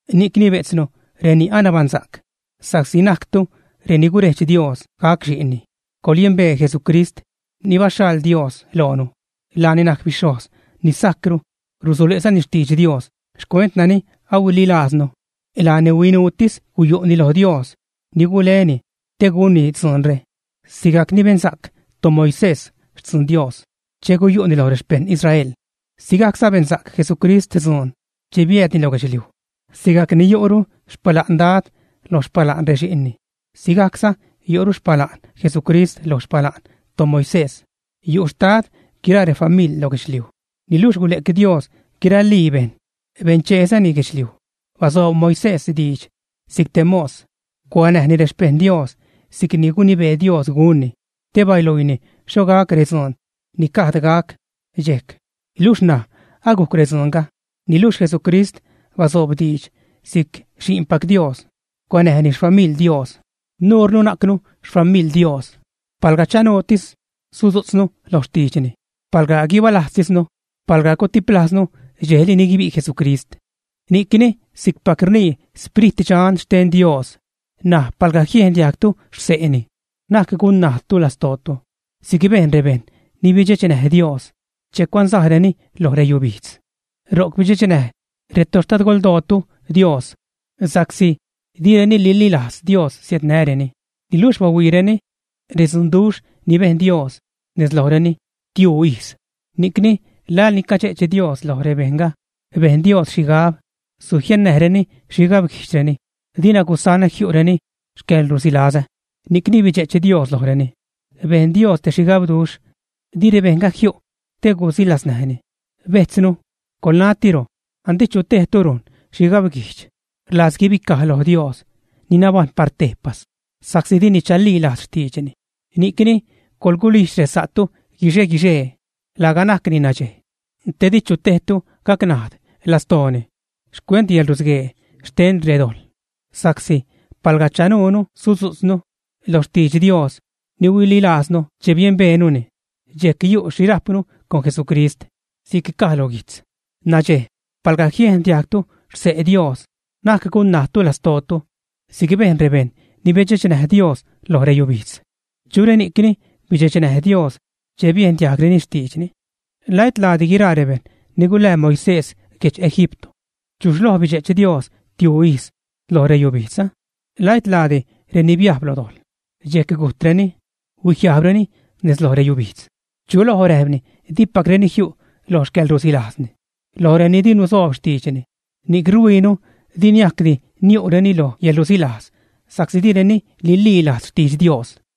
Ni'cni bejtznu, reni anabaṉsa'c, sa'csi najctu reni gurejdx Dios gac xi'nni, coḻyembee Jesucrist ni baxhaḻ Dios loonu. Laani najc bixhojz ni sajcru, rusule'zani xtidx Dios xcuent nani ahuililajznu. Laani huinuutis guyu'ni lo Dios ni guleni te gunni dzuunre. Sigajc ni bensa'c toMoisés xtzuun Dios che guyu'ni loj rexpejṉ Israel, sigajcza bensa'c Jesucrist dzuun che biäädni lo guedxliuj. Sigajc ni yu'ru xpala'n dad lo xpala'n rexi'nni, sigajcza yu'ru xpala'n Jesucrist lo xpala'n toMoisés. Yu' xtad guiraa refamiḻ lo guedxliuj, niluxh gule'c Dios guiralii bejṉ, bencheezani guedxliuj. Basoob Moisés diidx si'c te mos, cuanäjni rexpeṉ Dios si'cni gunibee Dios gunni, te baluiini xho gac redzuun ni gajd gac dxejc, luxh ṉaj agujc redzuunga. Niluxh Jesucrist basoob diidx si'c xi'npac Dios. Cuanäjni xfamiḻ Dios. Nurnu najcnu xfamiḻ Dios palga chanuutis sudzu'tznu lo xtiidxni, palga guibalajztisnu, palga gutiplajznu dxejli ni guibi' Jesucrist. Ni'cni, si'cpac rnii Sprit Dxan xten Dios: N̲aj, palga jiendiajgtu xse'ni, na'c gun-najdtu lastootu si'c bejn rebejṉ ni bidxechnäj Dios che cuansajreni lo reyubijdz. Ro'c bidxechnäj retoxtadgoldootu Dios sa'csi direni nililajz Dios siädnäreni, niluxh bahuiireni redzunduxh ni bejn Dios nez lojreni tiuu ijz. Ni'cni laḻ ni cadxe'ch Dios loj rebejṉga, bejn Dios xhigab: Sujiannäjreni xhigabguijdxreni, dina gusanä jiu'reni xcäḻrusilazä. Ni'cni bidxe'ch Dios lojreni, bejn Dios te xhigabduxh, di rebejṉga jiu' te gusilaznäjni. Bejtznu, coḻnatiro andi chu tejtu rujn xhigabguijdx, rlajz guibicaj lo Dios, ni nabajṉ par tejpas, sa'csi dini chalilajz xtiidxni. Ni'cni coḻgulijdx resa'tu guixe-guixee, laga najcni nadxej; te di chu tejtu gacnajd lastooni xcuent reyäḻrusguee xten redojḻ. Sa'csi palga chanuunu sudzu'tznu lo xtidx Dios ni huililajznu che biembeenuni, dxejc yu' xhi rajpnu con Jesucrist. Si'c caj lo guijtz: Nadxej, palga jiendiajgtu xse' Dios, na'c gunnajdtu lastootu si'c bejn rebejṉ ni bidxechnäj Dios lo reyubijdz. ¿Chu reni'cni bidxechnäj Dios che biendiajgreni xtiidxni? ¿La et laadi guiraa rebejṉ ni gulää Moisés guedx Egipto, ä? ¿Chuxh loj bidxe'ch Dios tiuu ijz lo reyubijdz, ä? ¿La et laadi reni biajb lo dojḻ, dxejc gujtreni, huijiajbreni nez loj reyubijdz, ä? ¿Chu loj räjpni dipacreni jiu' lo xcäḻrusilajzni? Loj reni di nusoob xtiidxni. Ni'c ruhuiinu di niajcdi niu'reni lo yäḻrusilajz sa'csi direni nililajz xtidx Dios.